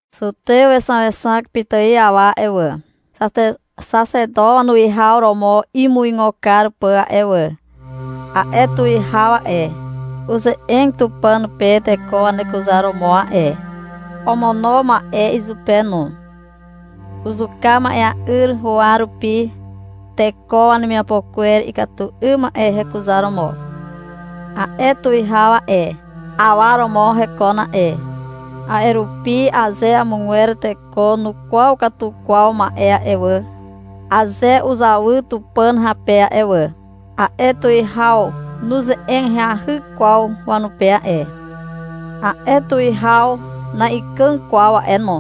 Zutew wexaexak pitài awa a'e wà, Xaxeto wanuwihaw romo imuigo kar pà a'e wà. A'e tuwihaw a'e, uze'eg Tupàn pe teko wanekuzaromo a'e. Omono ma'e izupe no. Uzuka ma'ea'yr huwa rupi, teko wanemiapo kwer ikatu 'ym ma'e hekuzaromo. A'e tuwihaw a'e, awa romo hekon a'e. A'e rupi aze amogwer teko nukwaw katu kwaw ma'e a'e wà, aze uzawy Tupàn hape a'e wà, a'e tuwihaw nuze'eg ahyahy kwaw wanupe a'e. A'e tuwihaw na'ikàg kwaw a'e no,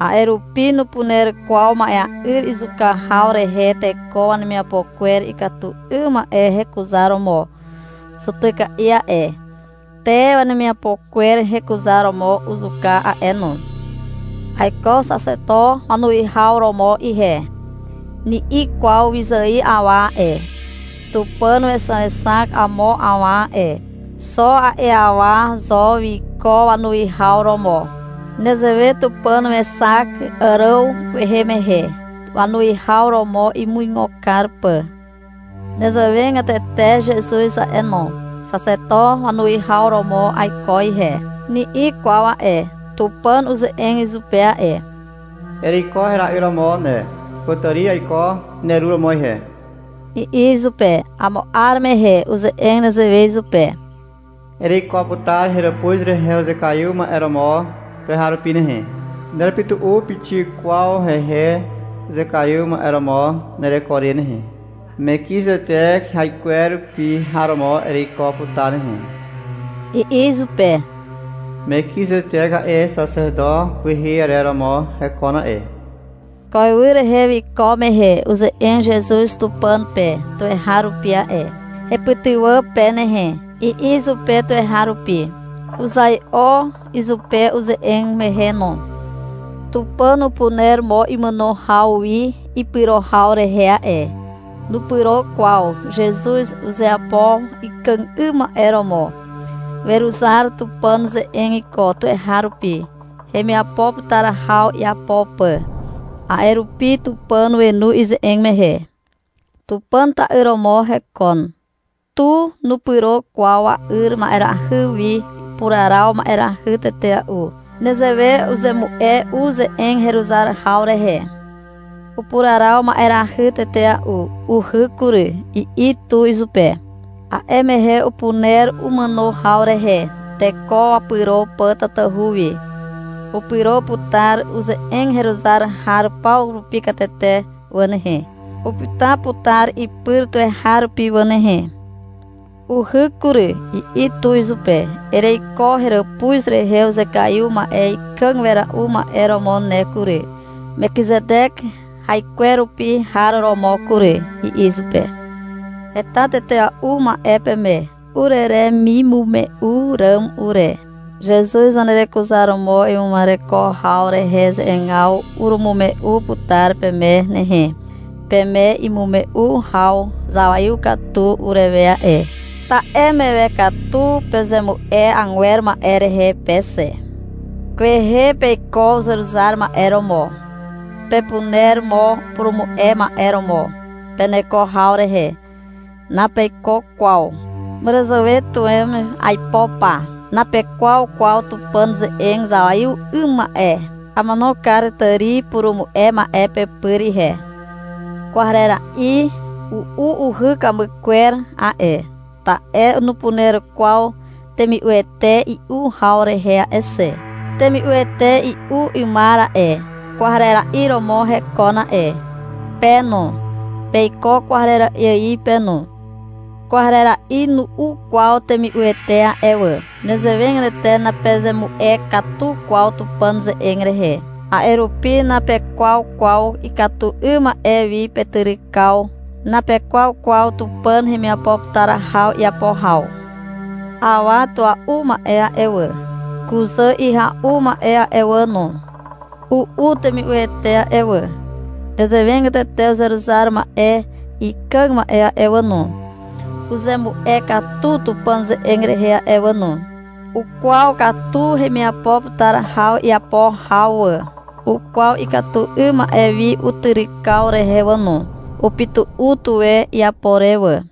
a'e rupi nupuner kwaw ma'ea'yr izuka haw rehe teko wanemiapo kwer ikatu 'ygwer hekuzaromo zutyka'i a'e, te wemiapo kwer hekuzaromo uzuka a'e no. — Aiko Xaxeto wanuwihaw romo ihe, ni'i kwaw wyzài awa a'e. Tupàn wexaexak amo awa a'e. Xo a'e awa zo wiko wanuwihaw romo. Nezewe Tupàn wexak Àràw kwehe mehe, wanuwihaw romo imuigo kar pà. Nezewegatete Zezuz a'e no. — Xaxeto wanuwihaw romo aiko ihe, ni'i kwaw a'e. Tupàn uze'eg izupe a'e. — Ereiko hera'yr romo ne. Kutàri aiko neru romo ihe, i'i izupe. Amo 'ar mehe uze'eg nezewe izupe. — Ereiko putar heràpuz rehe uzekaiw ma'e romo tuweharupi nehe. Nerepytu'u pixik kwaw hehe uzekaiw ma'e romo nereko re nehe. Mekizetek haikwerupi har romo ereiko putar nehe, i'i izupe. (Mekizetek a'e, Xaxeto kwehe arer romo hekon a'e.) Ko ywy rehe wiko mehe uze'eg Zezuz Tupàn pe tuweharupi a'e. — Hepytywà pe nehe, i'i izupe tuweharupi. Uzai'o izupe uze'eg mehe no. Tupàn upuner mo imàno haw wi ipyro haw rehe a'e. Nupyro kwaw. Zezuz uzeapo ikàg 'ym ma'e romo. Weruzar Tupàn ze'eg iko tuweharupi, hemiapo putar haw iapo pà. A'e rupi Tupàn wenu ize'eg mehe. Tupàn ta'yr romo hekon. Tu nupyro kwaw wa'yr ma'erahy wi. Upuraraw ma'erahy tetea'u. Nezewe uzemu'e u ze'eg heruzar haw rehe. Upuraraw ma'erahy tetea'u. — Uhyk kury, i'i tu izupe. A'e mehe upuner umàno haw rehe, teko wapyro pà tatahu wi. Upyro putar uze'eg heruzar har paw rupi katete wà nehe. Upyta putar ipyr tuweharupi wà nehe. — Uhyk kury, i'i tu izupe. — Ereiko heràpuz rehe uzekaiw ma'e ikàg wera'u ma'e romo ne kury, Mekizetek haikwerupi har romo kury, i'i izupe. Heta tetea'u ma'e peme ureremimume'u ràm ure. Zezuz zanerekuzaromo ima'ereko haw rehe ze'egaw urumume'u putar peme nehe. Peme imume'u haw zawaiw katu urewe a'e, ta'e mewe katu pezemu'e agwer ma'e rehe pe xe. Kwehe peiko uzeruzar ma'e romo. Pepuner mo upurumu'e ma'e romo peneko haw rehe. Napeiko kwaw. Màràzàwe tuwen aipo pa. Napekwaw kwaw Tupàn ze'eg zawaiw 'ym ma'e. Amono kar tàri purumu'e ma'e pepyr ihe. Kwarera'i u'u uhy ikamy kwer a'e, ta'e nupuner kwaw temi'uete i'u haw rehe a'e xe. Temi'uete i'u 'ymar a'e, kwarera'i romo hekon a'e. Pe no, peiko kwarera'i ài pe no. Kwarera'i nu'u kwaw temi'uete a'e wà. Nezewegatete napezemu'e katu kwaw Tupàn ze'eg rehe. A'e rupi napekwaw kwaw ikatu 'ym ma'e wi petyrykaw. Napekwaw kwaw Tupàn hemiapo putar haw iapo haw. Awa tua'u ma'e a'e wà, kuzà ihya'u ma'e a'e wà no, u'u temi'uete a'e wà. Nezewegatete uzeruzar ma'e ikàg ma'e a'e wà no, uzemu'e katu Tupàn ze'eg rehe a'e wà no. Ukwaw katu hemiapo putar haw iapo haw wà. Ukwaw ikatu 'ym ma'e wi utyrykaw rehe wà no. Upytu'u tuwe iapo re wà.